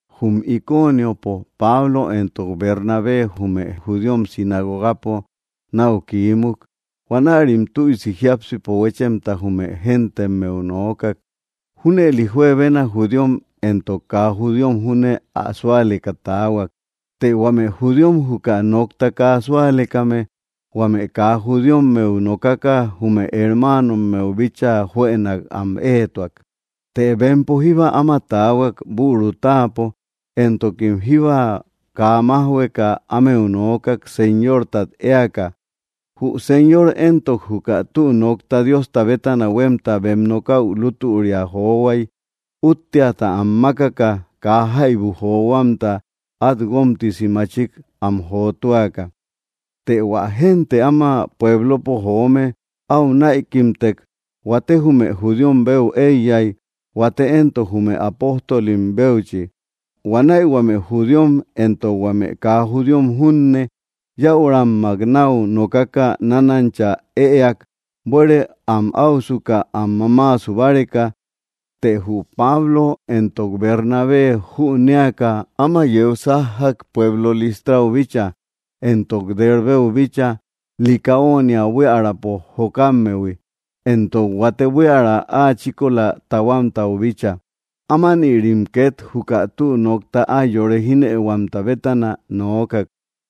Jum Iconiopo, Pablo éntok Bernabé jume judíom sinagogapo nau kiímuk, huanärim tüisi jiápsipo huéchemta jume géntemmeu noókak, junëli juebena judíom éntok kaa judíom júne ä súaleka taahuak. Të huame judíom juka nokta kaa súalekame huame kaa judíommeu nokaka jume hermánommeu bíchaa juënak am ëetuak. Të bempo jíba áma taahuak büru táapo, éntokim jíba kaa májhueka ámeu noókak Señórtat éaka. Jü Señor éntok, juka tü nokta Diosta bétana huemta bem nokäu lútüria johuai útteata am mákaka kaa jaibu johuamta at guómtisi machik am jotúaka. Të hua génte áma puéblopo joome au näikimtek. Huate jume judíom beu eiyai, huate éntok, jume apóstilim béuchi. Huanäi huame judíom éntok huame kaa judíom junne, yäurammak nau nokaka, nánancha ëeak buere am áusuka am mamáasu báreka. Të jü Pablo éntok Bernabé jünéaka áma yeu sájjak pueblo Lístrau bícha, éntok Derbeu bícha, Licaónia buíaräpo jokámmehui, éntok huate buiära áa chíkola tahuámtau bícha. Ámanïrim ket juka tü nokta ái yore jínëihuamta bétana noókak.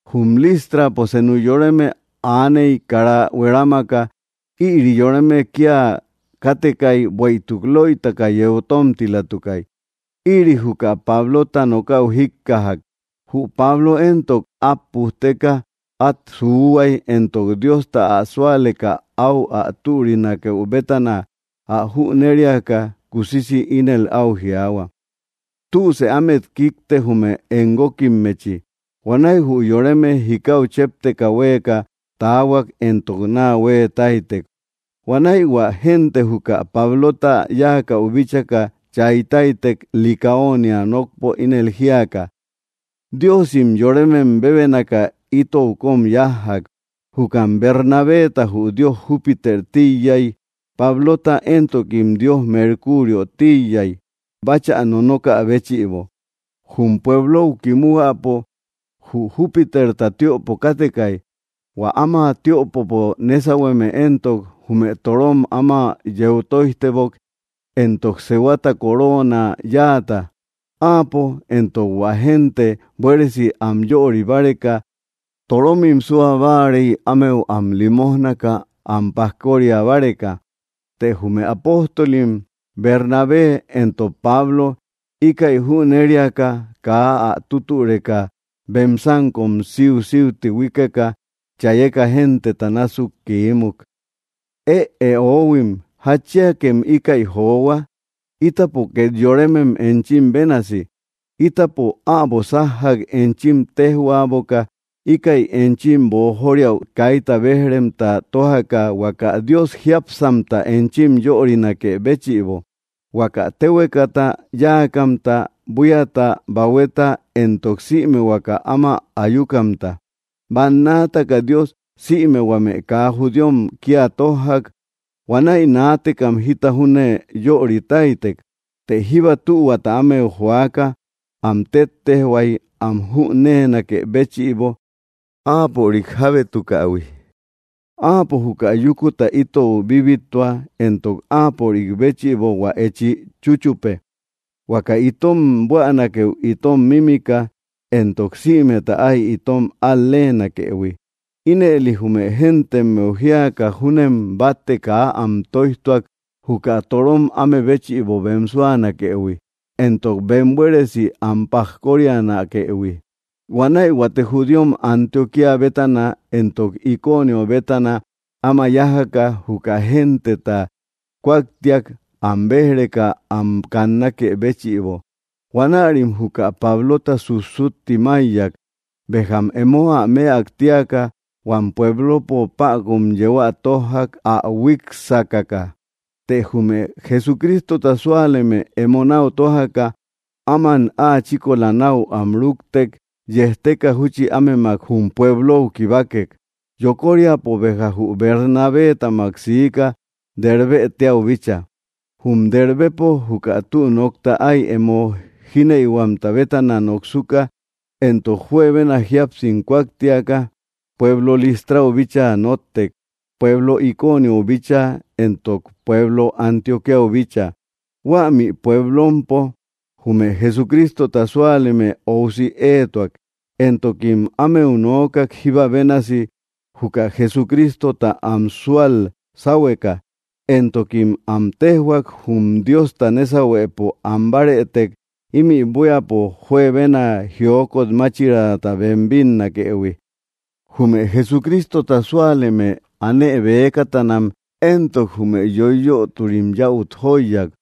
Jum Lístrapo senu yoreme aaney kara huerámaka. Ïri yoreme kia kátekai bueïtuk löitaka yeu tómtilatukay. Ïri juka Pablota nokäu jíkkajak. Jü Pablo éntok, at pujteka at suuhuai, éntok Diosta ä súaleka au ä türinakeu bétana ä jünériaka, kusisi ínel au jiaahua: —Tüsë ámet kikte jume em guókimmechi. Huanäi jü yoreme jikáu chépteka huéeka taahuak éntok naa hueetáitek. Huanäi hua génte juka Pablota yáakäu bíchaka, chaitáitek Licaónia nokpo ínel jíaka: —¡Diósim yorémem bébénaka itou kom yájjak! Jukam Bernabeta jü dios Júpiter tíiyai, Pablota éntokim dios Merkúriö tíiyai báchä nonokä béchïbo. Jum pueblou kimúhuäpo jü Júpiterta tiöpo katekay. Huä áma tiöpopo nésauhueme éntok, jume torom áma yeu tóijtebok éntok sehuata koróona yáata. Áapo, éntok hua génte, buéresi am yörï báreka, toromim súa báarei ámeu am limójnaka am pajkória báreka. Të jume apóstolim, Bernabé éntok Pablo, íkäi jüneriaka, kaa ä tútüreka bem sánkom síusíuti huíkeka chayeka genteta násuk kiimuk: —¡Ëe, oóhuim! ¿Jatchiakem íkäi johua? Ítapo ket yorémem enchim bénasi. Ítapo äbo sájjak enchim téjhuaboka íkäi enchim boojóriäu kaita béj‑remta tójaka huaka Dios jiápsamta enchim yörinakë béchïbo, huaka téhuekata yáakamta, buíata, bahueta, éntok sïme huaka áma ayúkamta. Bannaataka Dios sïme huame kaa judíom kia tójjak, huanäi naatekam jita júne yöritáitek. Të jíba tühuata ámeu joaka am téttejhuai am jüneenakë béchïbo áapörik jábétukähui. Áapo juka yúkuta itou bibittua, éntok áapörik béchïbo hua echi chúchupe. Huaka itom buänakeu itom mímika, éntok sïmeta ái itom al‑lénakëhui. Ínëli jume géntemmeu jíaka júnem batte kaa am tóijtuak juka torom áme béchïbo bem súanakëhui, éntok bem buéresi am pajkórianakëhui. Huanäi huate judíom Antioquía bétana éntok Iconio bétana áma yájaka, juka genteta kúaktiak am béj‑reka am kannákë béchïbo. Huanärim juka Pablota sussutti máiyak. Béjam emo ä mëak tíaka, huam puéblopo päkun yeu ä tójjak ä huík sákaka. Të jume Jesucristota súaleme emo nau tójaka áman áa chíkola nau am rúktek, yejteka júchi ámemak jum pueblou kibákek. Yokóriapo béja jü Bernabétamak siika Dérbë téäu bícha. Jum Dérbepo juka tü nokta ái emo jínëihuamta bétana noksuka, éntok juebena jíapsim kúaktiaka, pueblo Listrau bíchaa nóttek, pueblo Iconiou bíchaa éntok pueblo Antioquíau bícha. Huämi puéblompo jume Jesucrístota súaleme óusi éetuak, éntokim ámeu noókak jíba bénasi juka Jesucrístota am súal sáhueka. Éntokim am téjhuak jum Diosta nésauhuëpo anbárëtek, imi buíapo juebena jiókot máchiraata bem bínnakëhui. Jume Jesucrístota súaleme anëbëkatanam éntok, jume yoiyöturim yäut jóiyak.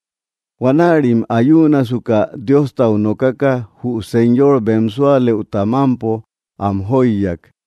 Huanärim ayúunasuka, Diostau nokaka jü Señor bem súalëuta mampo am jóiyak.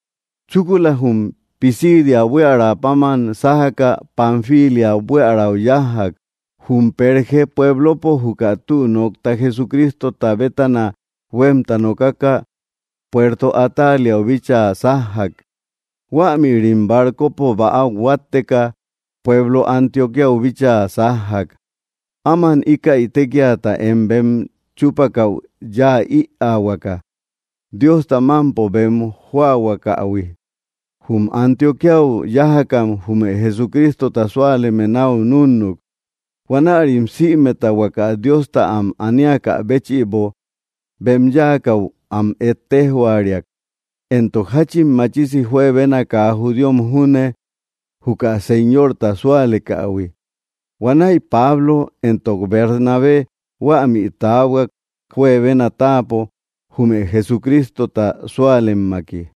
Chúkulam jum Pisidia buiära páman sájaka Panfília buíarau yájjak. Jum Pérge pueblopo juka tü nokta Jesucrístota bétana huemta nokaka puerto Atáliau bíchaa sájjak. Huämïrim barcopo bäau huátteka pueblo Antioqüiau bíchaa sájjak, áman íkäi tékiata én bem chúpakäu yaä ïaahuaka, Diosta mampo bem jóahuakähui. Jum Antioquíau yájakam jume Jesucrístota súaleme nau núnnuk. Huanärim sïmeta huaka Diosta am aníakä béchïbo bem yáakäu am ettéjhuariak, éntok jachin machisi juebena kaa judíom júne juka Señorta súalekähui. Huanäi Pablo éntok Bernabé huämi tahuak juebena táapo jume Jesucrístota súalemmaki.